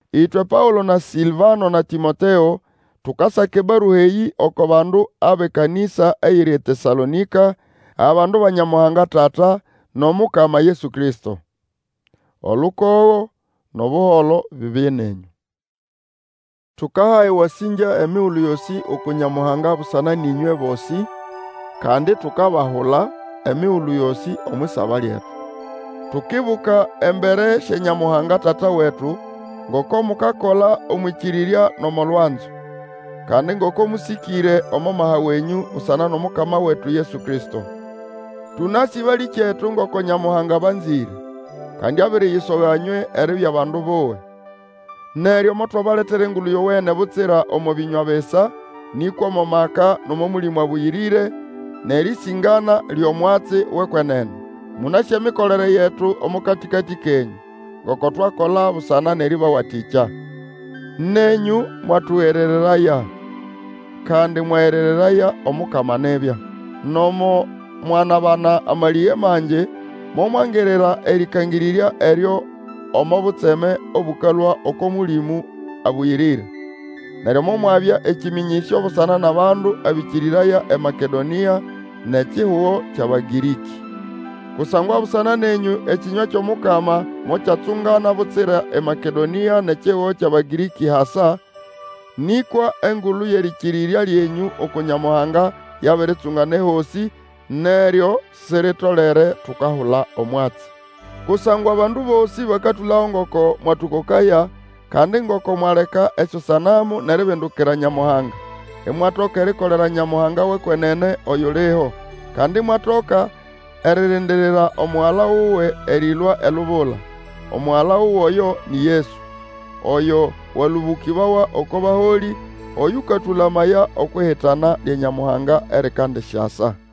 Ĩtwe Paũlo na Sĩlvano na Tĩmoteo, tukasaka ebarua eyĩ oko bandu abʼekanĩsa eyiri eTesalonĩka, abandu ba Nyamuhanga Tata nʼOmukama Yesu Kristo. Olukogo nʼobuholo bibye nenyũ. Tukaha ewasĩngya emigulu yosĩ uku Nyamuhanga busana nʼĩnywe bosĩ, kandi itukabahula emigulu yosĩ omwʼisaba lyetu. Tukibuka embere sya Nyamuhanga Tata wetu, ngoko mukakola omwʼĩkĩrĩrya nʼomo lwanzo; kandi ngoko mũsĩkĩre omo maha wenyũ busana nʼOmukama wetu Yesu Kristo. Tũnasĩ, balĩkyetu, ngoko Nyamuhanga abanzĩre, kandi abiriyisoga nywe eribya bandu buwe. Neryo motwabaletera Engulu Yowene, butsira omo bĩnywa bisa, nĩkwa omo maka, nʼomo Mũlĩmũ Abũyĩrĩre, nʼerĩsĩngana lyʼomwatsi wʼekwenene. Mũnasĩ emikolere yetu omo katĩkatĩ kenyũ; ngoko twakola busana nʼerĩbawatĩkya. Nenyũ mwatũgerereraya, kandi mwagerereraya Omukama nibya. Nomo mwanabana amalĩge mangi, momwangirira erĩkangĩrĩrya eryo omo butseme obũkalũa oko Mũlĩmũ Abũyĩrĩre. Neryo momwabya ekĩmĩnyĩsyo busana nʼabandu abĩkĩrĩraya eMakedonĩa nʼekihugo kyʼAbagĩrĩkĩ. Kusangwa busana nenyũ ekĩnywa kyʼomukama mokyatsungana butsira eMakedonĩa nʼekihugo kyʼAbagĩrĩkĩ hasa, nĩkwa engulu yʼerĩkĩrĩrya lyenyũ uku Nyamuhanga yabiritsungana ehosĩ, neryo siritolere tukahula omwatsi. Kusangwa abandu bosĩ bakatũlago ngoko mwatũkokaya, kandi ngoko mwaleka esyosanamu nʼeribindukira Nyamuhanga, imwatoka erikolera Nyamuhanga wʼekwenene, oyuliho. Kandi imwatoka eririndirira Omugala wuwe erĩlũa elubula. Omugala wuwe oyo ni Yesu, oyo walũbũkĩbawa oko baholĩ, oyũkatũlamaya okwʼihitana lya Nyamuhanga erikandisyasa.